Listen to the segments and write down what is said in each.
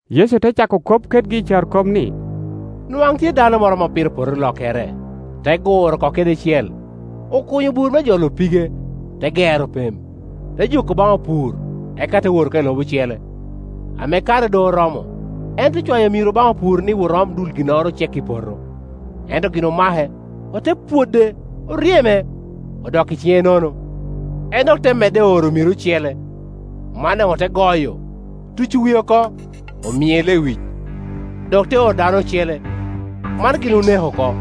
Yecu te cako kop kedgi i carokop ni, “Nwaŋ tye dano moro ame opito poto olokkere, te guro oko kede cel, okunyo bur me jolo pige, te gero pem, te joko baŋ opur, eka te wot oko i lobo ocele. Ame kare doŋ oromo, en te cwayo amiro baŋ opur ni wot om dul ginnoro ocek i peto. Ento gin omake, ote pwode, oryeme, odok i ciŋe nono. En dok te medde oro amiro ocele; man daŋ ote goyo, tuco wie oko, omie lewic. Dok te oro dano ocele, man gin oneko oko.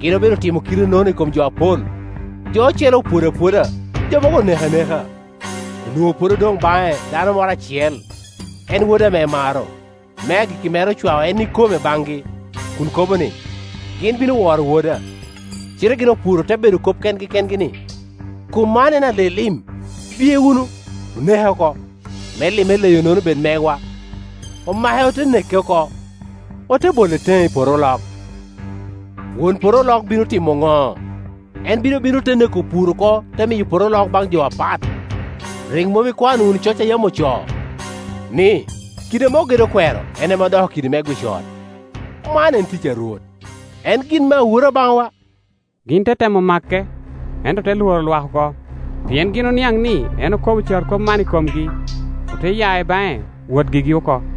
Gin obedo limo kite-nono i kom jo apol; jo ocele opwodo apwoda, jo mogo oneko aneka. Onwoŋo pwod odoŋ baŋe dano moro acel, en wode ame emaro. Me agikki mere ocwao en ikome baŋgi, kun kobo ni, ‘Gin bino woro woda.’ Cite gin opur ote bedo kop kengi kengi ni, ‘Kom man en ale-lim; biye wunu, oneke oko, me lim eleyo-nono bed megwa’. Omake ote neke oko, ote bole teŋe i poto olok. Won poto olok bino timo ŋo? En bino bino, te neko opur-ru oko, te miyo poto olok baŋ jo apat. Rik mom ikwano wunu coc man a yam ocoo, ni, ‘Kidi ame ogedo okwero en ame odoko kidi me gwic ot; man en tic a Rwot, en gin me awura baŋwa?’” Gin te temo make, ento ote lworo lwak oko, pien gin oniaŋ ni en okobo carokop man i komgi. Ote ya i baŋe wot gigi oko.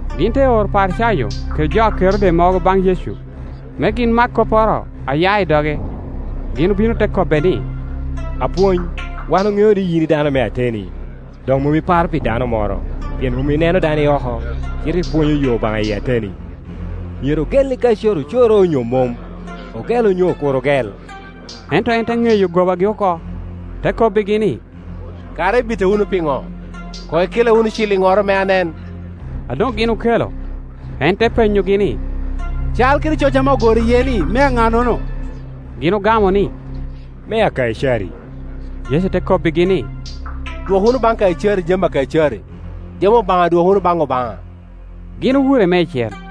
Gin te oro Oparicayo kede jo a Kerode mogo baŋ Yecu, me gin mak kopporo a ya i doge. Gin obino te kobbe ni, “Apwony, wan oŋeo ni yin dano me ateni, dok mom iparo pi dano moro, pien mom ineno dano i oko, cite ipwonyo yo Obaŋa i ateni, Myero ogelli Kaicari ocoro onyo mom? Ogel onyo kur ogel?” Ento en te ŋeyo gobagi oko, te kobbigi ni “Kara ibita wunu pi ŋo? Koŋ ikella wunu ciliŋnoro, me anen.” A doŋ gin okelo, en te penyogi ni, “Cal kede coc ame ogoro iye-ni mea ŋa-nono?” Gin ogamo ni, “Mea Kaicari.” Yecu te kobbigi ni, “Dwok wunu baŋ Kaicari jami a Kaicari, jami Obaŋa dwok wunu baŋ Obaŋa.” Gin owure meicel.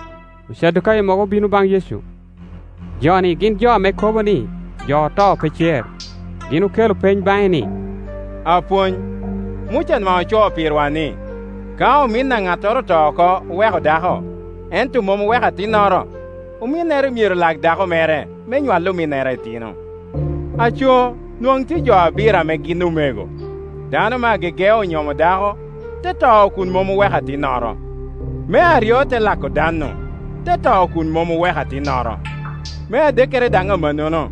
Ocadukayo mogo obino baŋ Yecu; jo-ni gin jo ame kobo ni jo oto pe cer. Gin okelo peny baŋe ni, “Apwony, Muca nwaŋ ocoo pirwa ni, ka omin a ŋattoro oto oko, oweko dako, ento mom oweko atinnoro, ominnere myero lak dako mere me nywal ominnere itino. Aco, nwaŋ tye jo abiro ame gin omego. Dano me agege onyomo dako, te to kun mom oweko atinnoro; me aryo te lako dan-nu, te to kun mom oweko atinnoro; me adekkere daŋ amannono;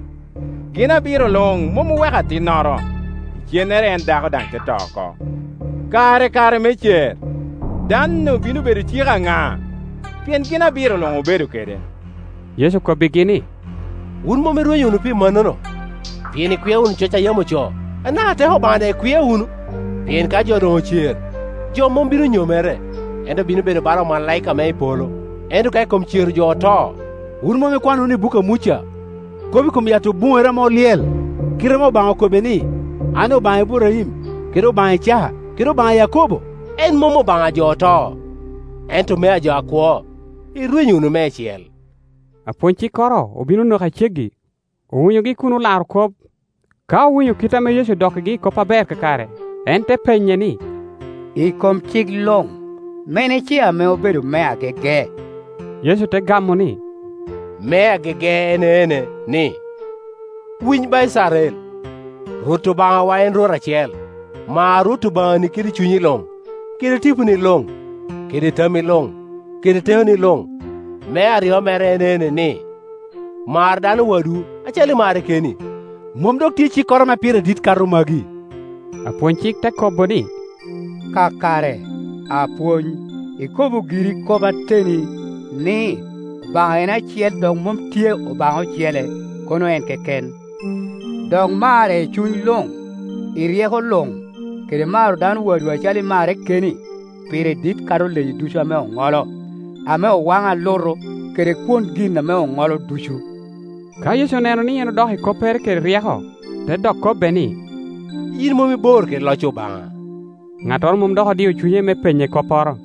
gin abiro luŋ mom oweko atinnoro, lcennere en dako daŋ te to oko. Kara i kare me cer, dan-nu bino bedo cik a ŋa? Pien gin abiro luŋ obedo kede.” Yecu okobbigi ni, “Wun mom irwenyo wunu pi mannono, pien ikwia wunu coc a yam ocoo, anaka teko Obaŋa daŋ ikwia wunu? Pien ka jo doŋ ocer, jo mom bino nyomere, ento bino bedo bala omalaika ame i polo. Ento ka i kom cero jo oto, wun mom ikwano wunu i buk a Muca, kop i kom yat obuŋere ame olyel, kite ame Obaŋa okobbe ni, ‘An Obaŋa Iburaim, kede Obaŋa Icaka, kede Obaŋa a Yakobo?’ En mom Obaŋa a jo oto, ento mea jo akwo; irwenyo wunu meicel.” Apwony-cikkoro obino onoke a ceggi, owinyogi kun olaro kop. Ka owinyo kit ame Yecu odokkigi i kop aber kakare, en te penye ni, “I kom cik luŋ, mene ce ame obedo me agege?” Yecu te gamo ni, “Me agege en ene, ni, ‘Winy ba Icrael, Rwot Obaŋawa en Rwot acel; mar Rwot Obaŋani kede cunyi luŋ, kede tiponi luŋ, kede tammi luŋ, kede tekoni luŋ.’ Me aryo mere en ene, ni, ‘Mar dano wadwu acalo imarre keni.’ Mom dok tye cikkoro ame pire dit kato magi.” Apwony-cik te kobo ni, “Kakare, Apwony; ikobo giri kop ateni, ni, Obaŋa en acel, dok mom tye Obaŋa ocele, kono en keken. Dok mare i cuny luŋ, i ryeko luŋ, kede maro dano wadwu acalo imarre keni, pire dit kato leyi ducu ame oŋolo, ame owaŋo alutu, kede kwon gin ame oŋolo ducu.” Ka Yecu oneno ni en odok i koppere kede ryeko, te dok kobbe ni “Yin mom ibor kede loc Obaŋa.” Ŋattoro mom dok odio cunye me penye kopporo.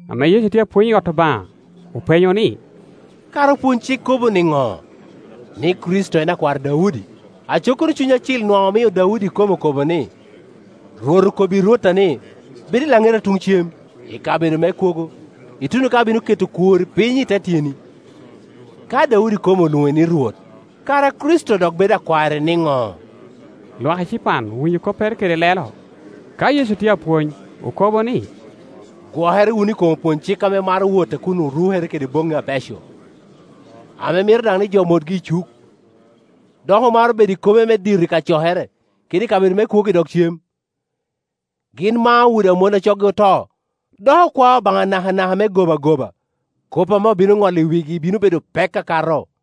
Ame Yecu tye apwony i ot Obaŋa, openyo ni, “Kara opwony-cik kobo niŋo ni, Kricito en akwar Daudi? Aco kono Cuny Acil nwaŋ omio Daudi ikome okobo ni, ‘Rwot okobbi Rwotta ni, Bed i laŋeta tuŋ cem, i kabedo me kwogo, ituno ka abino keto okworri piny i te tyeni.’ Ka Daudi ikome olwoŋe ni Rwot, kara Kricito dok bedo akwarre niŋo?” Lwak ecipan owinyo koppere kede lelo. Ka Yecu tye a pwony, okobo ni, “Gwokere wunu i kom opwony-cik ame maro wot a kun orukere kede boŋŋi abeco, ame mito daŋ ni jo motgi i cuk, dok omaro bedo i kome me dito i kacokere, kede i kabedo me kwogo i dog cem. Gin mao udi a mon a coggi oto, dok okwao Obaŋa nakanaka me gobagoba. Kop ame obino ŋolo i wigi bino bedo pek akato.”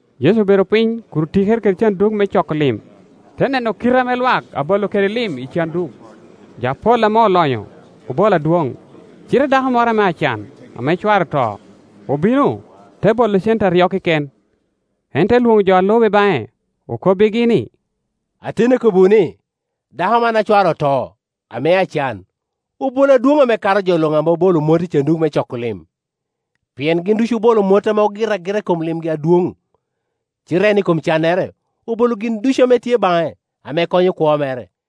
Yecu obedo piny kun otikere kede canduk me coko lim, te neno kite ame lwak abolo kede lim i canduk. Jo apol ame olonyo obolo adwoŋ. Cite dako moro ame acan, ame cware oto, obino, te bolo cente aryo keken. En te lwoŋo jo a lube baŋe, okobbigi ni, “Ateni akobbiwu ni, dako man a cware oto, ame acan, obolo adwoŋ ame kato jo luŋ ame obolo mot i canduk me coko lim; pien gin ducu obolo mot ame ogito agita i kom limgi adwoŋ, cite en i kom cannere obolo gin ducu ame tye baŋe, ame konyo kwo mere.”